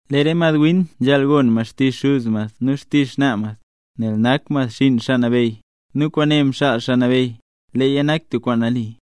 Lee re madwin nzhaal gon mad xtizh xuz mad nu xtizh xnaa mad, nel nak mad xinn Xaa Nabeyy, nu kwaane mxaal Xaa Nabeyy, leeya nak tub kwaan nali.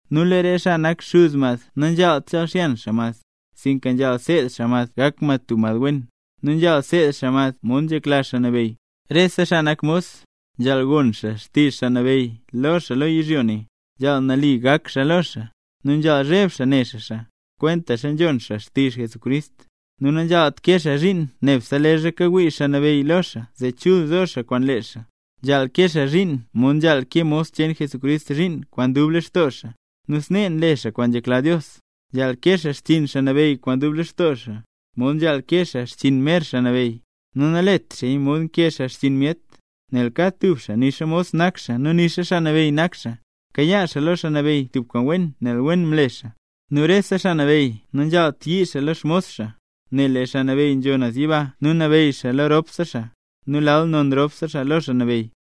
Nu lee re xaa nak xuz mad nanzhaalt chal xyan xaa mad, sinka nzhaal seed xaa mad gak mad tub mad wen, nu nzhaal seed xaa mad mod nzhekla Xaa Nabeyy. Rese xaa nak mos, nzhaal gon xaa xtizh xaa nabeyy lo xaa lo yizhyo ne, nzhaal nali gak xaa lo xaa, nu nzhaal zheb xaa ne xaa xaa, kwentaxa nzhon xaa xtizh Jesucrist. Nu nanzhaalt kee xaa zhiin nebse leezha kawii xaa nabeyy lo xaa zee chul zo xaa kwaan lee xaa, nzhaal kee xaa zhiin mod nzhaal kee mos cheen Jesucrist zhiin kwaan dub lextoo xaa, nu snee nle xaa kwaan nzhekla Dios. Nzhaal kee xaa xchiin xaa nabeyy kwaan dub lextoo xaa, mod nzhaal kee xaa xchiin mer Xaa Nabeyy, nu nalet xaaya mod nkee xaa xchiin myet. Nel kad tub xaa, nixa mos nak xaa nu nixa xaa nabeyy nak xaa, kayaa xaa lo Xaa Nabeyy tub kwaan wen nel wen mle xaa. Nu rese xaa nabeyy nanzhaalt yii xaa lo xmos xaa, nel lee Xaa Nabeyy nzho naz yiba nu nabeyy lo ropse xaa; nu lal non ropse lo Xaa Nabeyy.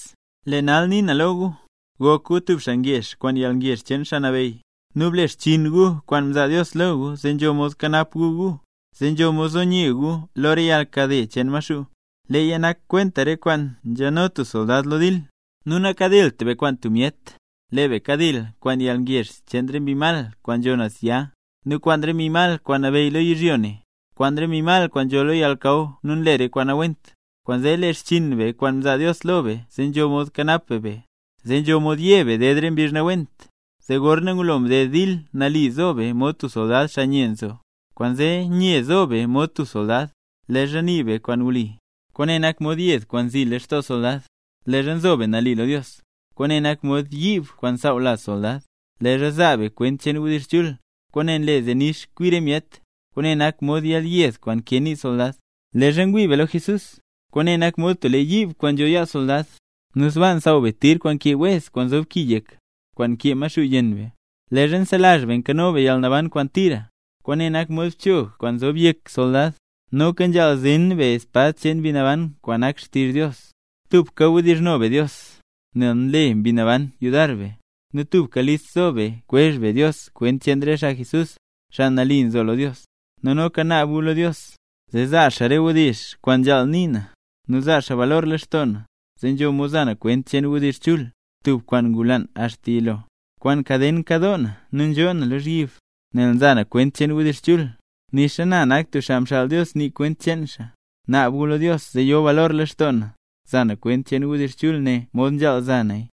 Lee nal nii na lo gu, gok gu tub xaa ngezh kwaan yalngezh cheen Xaa Nabeyy. Nu ble xchiin gu kwaan mzaa Dios lo gu zee nzho mod kanap gu gu, zee nzho mod zo nye gu lo re yalnkade cheen Maxuu. Leeya nak kwenta re kwaan nzheno tub soldad lo dil. Nu nakadilt be kwaan tub myet, lee be kadil kwaan yalngezh cheen re mbi mal kwaan nzho naz ya, nu kwaan re mbi mal kwaan nabeyy lo yizhyo ne, kwaan nzho lo yalnakaw nu nle re kwaan nawent. Kwaanzee, le xchiin be kwaan mzaa Dios lo be zee nzho mod kanap be be, zee nzho mod ye be ded be re mbizh nawent, zee gorna ngulo mded dil nali zo be mod tub soldad xaa nye nzo. Kwaanzee nye zo be mod tub soldad. Leezha nii be kwaan wli, kwaane nak mod yed kwaan nzii soldad lextoo soldad. Leezha nzo be nali lo Dios, kwaane nak mod yiib kwaan nsaaw laz soldad. Leezha zaa be kwent cheen wdizh chul, kwaan nle zee nix kwi re myet, kwaane nak mod yelyed kwaan nkee nii soldad. Leezha ngwii be lo Jesús, kwaane nak mod tub lee yiib kwaan nzho yaa soldad, nu sbaa nsaaw be tir kwaan nkee wez kwaan ki yek, kwaan nkee Maxuu yenn be. Leezha nselazh be nkano be yalnaban kwaan tira, kwaane nak mod bchog nzob yek soldad. Noka nzhaal zen be espad cheen Mbi Naban kwaan nak xtizh Dios. Tubka wdizhno be Dios, nel Mbi Naban nle yudar nii be. Nu tubka list zo be kwezh be lo Dios kwent cheen re xaa Jesús, xaa nambey. Nu noka naab gu lo Dios, zee zaa xaa re wdizh kwaan nzhaal nii na, nu zaa xaa balor lextoo na, zee nzho mod za na kwent cheen wdizh chul, tub kwaan ngulaan axta yilo. Kwaan kaden nkadoo na nu nzhoo na lozhyib, nel nza na kwent cheen wdizh chul, nixa na nak tub xaa mxaal Dios nii kwent cheen xaa. Naab gu lo Dios zee yo balor lextoo na za na kwent cheen wdizh chul ne mod nzhaal za naya.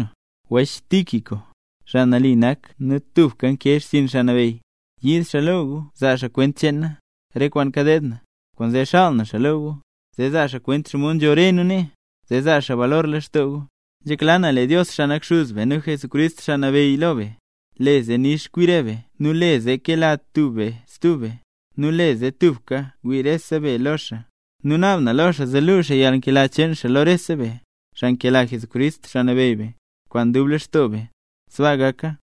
Wech Tíquico, xaa nali nak nu tubka nkee xchiin Xaa Nabeyy, yiid xaa lo gu zaa xaa kwent cheen na, re kwaan kadeed na. Kwaanzee xaal na xaa lo gu, zee zaa xaa kwent xomod nzho re nu nee, zee zaa xaa balor lextoo gu. Nzhekla na lee Dios, xaa nak Xuz be, nu Jesucrist, Xaa Nabeyy lo be, le zee nix kwi re be nu le zee kela tub be stub be, nu le zee tubka ngwii rese be lo xaa. Nu naab na lo xaa zee luu xaa yalnkela cheen xaa lo rese be, xaa nkela Jesucrist, Xaa Nabeyy be, kwaan dub lextoo be. Sbaa gaka.